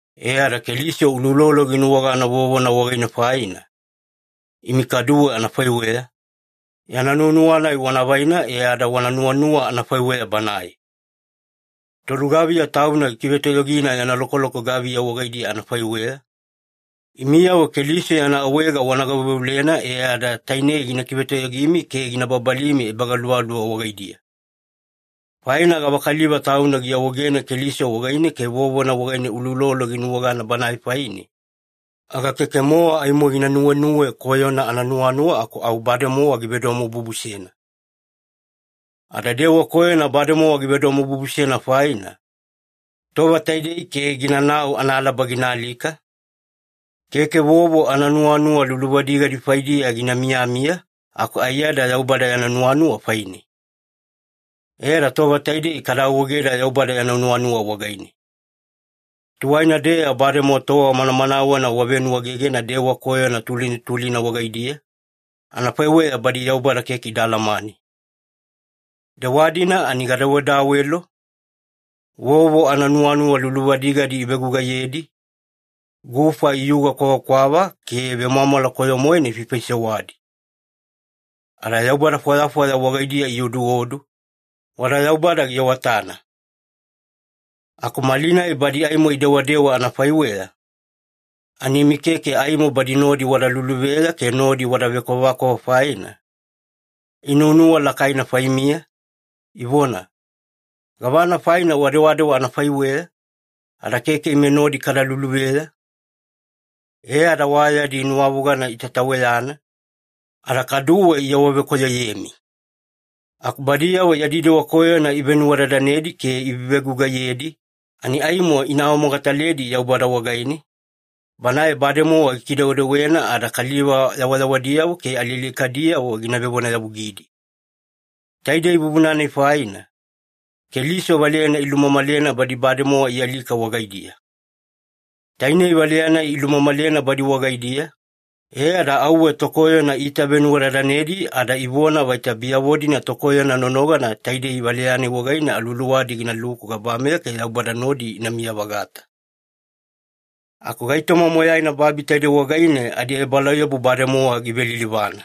E ada Keliso uloulolo ginuwagana vovona wagaine faina, imi kaduwe anafaiweya, yana nuwanuwa-nai wana vaina e ada wana nuwanuwa anafaiweya Banae. Tolugaviya tauna gikivetoyogina yana lokoloko gaviya wagaidiya anafaiweya, imiyavo Keliso yana awaega wana gaveuveulena e ada tainei gina kivetoyogimi ke gina babalimi ebagaluvaluva wagaidiya. Faina gavakaliva tauna giawaegena Keliso wagaine ke vovona wagaine uloulolo ginuwagana Banae faine, aga keke-mowa aimo gina nuwenuwe koyona ananuwanuwa aku au bademowa givedomobubusena. Ada dewa koyona bademowa givedomobubusena faina, tova taidei ke ginanau analaba gina alika, keke vovo ananuwanuwa luluvadigadi faidiya gina miyamiya aku aiyada Yaubada yana nuwanuwa faine. E ada tova taidei kada awaegeda Yaubada yana nuwanuwa wagaine. Tuwaina-deya bademowa tova manamanawena wavenuwaegegena dewa koyona tulina tulina wagaidiya, anafaiweya badi Yaubada keke ida alamane. Dewa-dina ani igadawedawelo, vovo ananuwanuwa luluvadigadi ivegugaiyedi, gufa iyuga kwavakwava, ke vemwamwala koyo-moena ifaifaisewadi. Ada yaubada fwayafwaya wagaidiya ioduodu, wada Yaubada giawatana. Aku malinai badi aimo idewadewa anafaiweya, ani imi keke aimo badi nodi wada luluveya ke nodi wada vekwavakwava faina, inuwanuwa lakaina faimiya, ivona, “Gavana faina wadewadewa anafaiweya, ada keke ime nodi kada luluveya?” E ada wa yadi nuwavogana itataweyana, ada kaduwe iawavekoyoyemi. Aku badiyavo yadi dewa koyona ivenuwadadanedi ke ivevegugaiyedi, ani aimo ina awamogataledi Yaubada wagaine, Banae bademowa gikidewedewena ada kaliva yawayawadiyavo ke alialikadiyavo gina vevonayavugidi. Taidei vuvuna-nai faina, Keliso valeyana ilumamalena badi bademowa ialika wagaidiya. Tainei valeya-nai ilumamalena badi wagaidiya, e ada auwe tokoyona iitavenuwadadanedi ada ivona vaita biyavo-dina tokoyona nonogana taidei valeya-nai wagaine aluwaluwadi ginaluku gabameya ke Yaubada nodi inamiya-vagata. Aku gaitoma moyaina babi taidei wagaine adiebalauyabu bademowa givelilivana.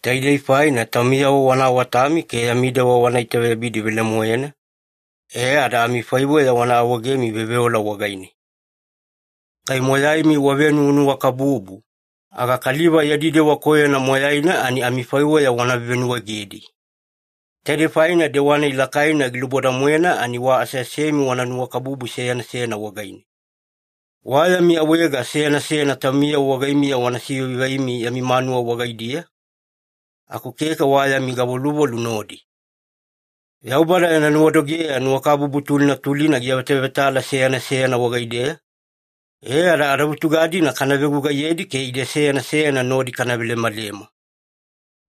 Taidei faina taumiyavo wana awatami ke yami dewa wana itaveyabidi velemoena, e ada amifaiweya wana awaegemi veoveola wagaine. Kai moyaimi wavenuwanuwakabubu, aga kaliva yadi dewa koyona moyaina ani amifaiweya wana vevenuwaegedi. Taidei faina dewa-nai lakaina giluboda-moena ani wa aseasemi wana nuwakabubu seyana seyana wagaine. Wa yami awaega seyana seyana taumiyavo wagaimiya wana sivaivaimi yami manuwa wagaidiya, aku keke wa yami gavoluvolu nodi. Yaubada yana nuwadogeya nuwakabubu tulina tulina giavetavetala seyana seyana wagaideya, e ada adavutuga-dina kana vegugaiyedi ke ide seyana seyana nodi kana velemalema.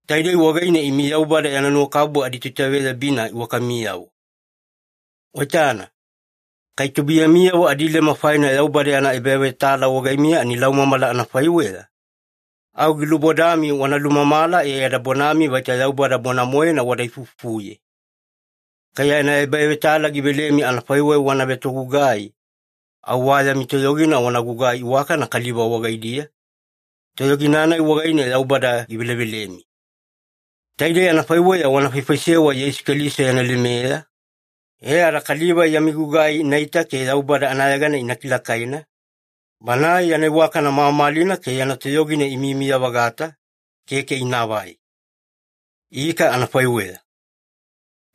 Taidei wagaine imi Yaubada yana nuwakabubu aditoitaveyabina iwakamiyavo. Waitana, kai tubuiyamiyavo adileme faina Yaubada yana ebavetala wagaimiya ani laumamala anafaiweya, au gilubodami wana lumamala e ada bonami vaita Yaubada bona-moena wada ifuifufuye. Kai yana ebavetala givelemi anafaiweya wana vetogugai, au wa yami toyogina wana gugai iwakana kaliva wagaidiya, toyogina-nai wagaine Yaubada givelevelemi. Taidei anafaiweya wana faifaisewa Yeisu Keliso yana lemeya, e ada kaliva yami gugai inaita ke Yaubada anayegana ina kilakaina, Banae yana iwakana mamalina ke yana toyogina imiyamiya-vagata, keke inaavai. Ika anafaiweya.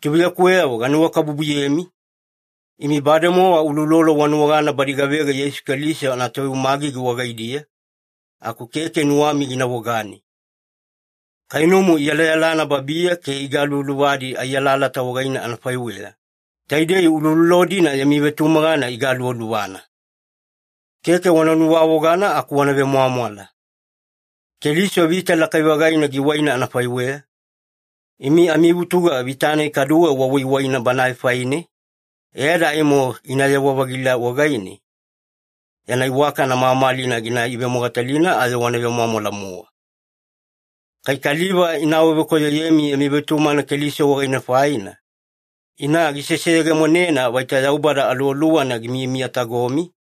Tubuiyakuweyavo ganuwakabubuyemi, imi bademowa uloulolo wanuwagana badi gavega Yeisu Keliso anatoveumagigi wagaidiya, aku keke nuwami gina vogani. Kainumu iyalayalana babiya ke igaluvaluvadi ai alalata wagaine anafaiweya, taidei uloulolo-dina yami vetumagana igaluvaluvana. Keke wana nuwavogana aku wana vemwamwala. Keliso vita lakai-vagaina giwaina anafaiweya, imi amivutuga vita-nai kaduwe wawaiwaina Banae faine, e ada aimo ginayewa-vagila wagaine, yana iwakana mamalina gina ivemogatalina ayo wana vemwamwala-mowa. Kai kaliva ina awavekoyoyemi yami vetumagana Keliso wagaine faina, ina giseseyegemonena vaita Yaubada Aluwaluwana gimiyamiyatagomi,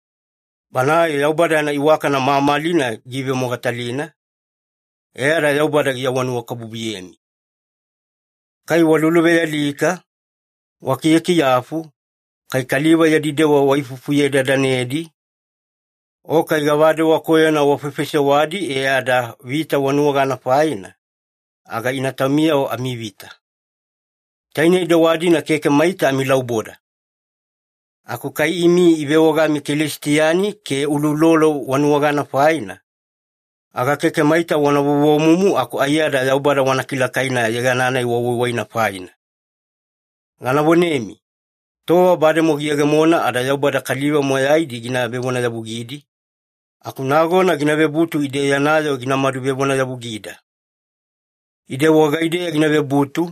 Banae Yaubada yana iwakana mamalina giivemogatalina, e ada Yaubada giawanuwakabubuyemi. Kai waluluvealika, wakiyakiyafu, kai kaliva yadi dewa waifuifufuye-dadanedi, o kai gavadewa koyona wafaifaisewadi e ada vita wanuwagana faina, aga ina taumiyavo amivita. Tainei dewa-dina keke maita amilauboda. Aku kai imi ivewagami Kelisitiani ke uloulolo wanuwagana faina, aga keke maita wana vovomumu aku aiyada Yaubada wana kilakaina yegana-nai wawaiwaina faina. Gana vonemi, tova bademowa giyegemona ada Yaubada kaliva moyaidi gina vevonayavugidi, aku nagona gina vebutu ide yana yoo ginamadu vevonayavugida. Ide wagaideya gina vebutu,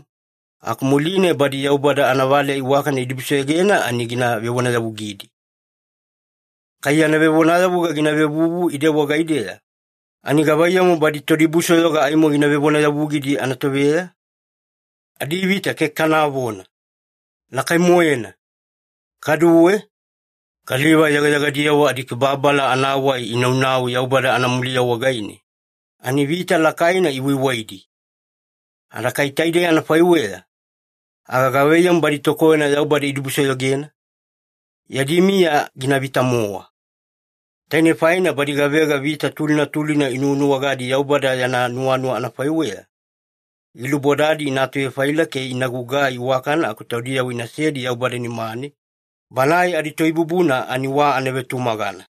aku muline badi Yaubada anavaleya iwakana idibusoyogena ani gina vevonayavugidi. Kai yana vevonayavuga gina vevuvu ide wagaideya, ani gavaiyamu badi todibusoyoga aimo gina vevonayavugidi anatoveya? Adivita keke kanavona! Lakai-moena! Kaduwe, “Kaliva yegayegadiyavo adikibababala anawai inaunau Yaubada anamuliya wagaine, ani vita lakaina iwaiwaidi. Ada kai taidei anafaiweya, aga gavaiyamu badi tokoyona Yaubada idibusoyogena? Yadi miya ginavita-mowa.” Tainei faina badi gavega vita tulina tulina inuwanuwagadi Yaubada yana nuwanuwa anafaiweya, gilubodadi ina atuvefaila ke ina gugugai iwakana aku taudiyavo inasedi Yaubada nimane, Banae adiToibubuna ani wa anavetumagana.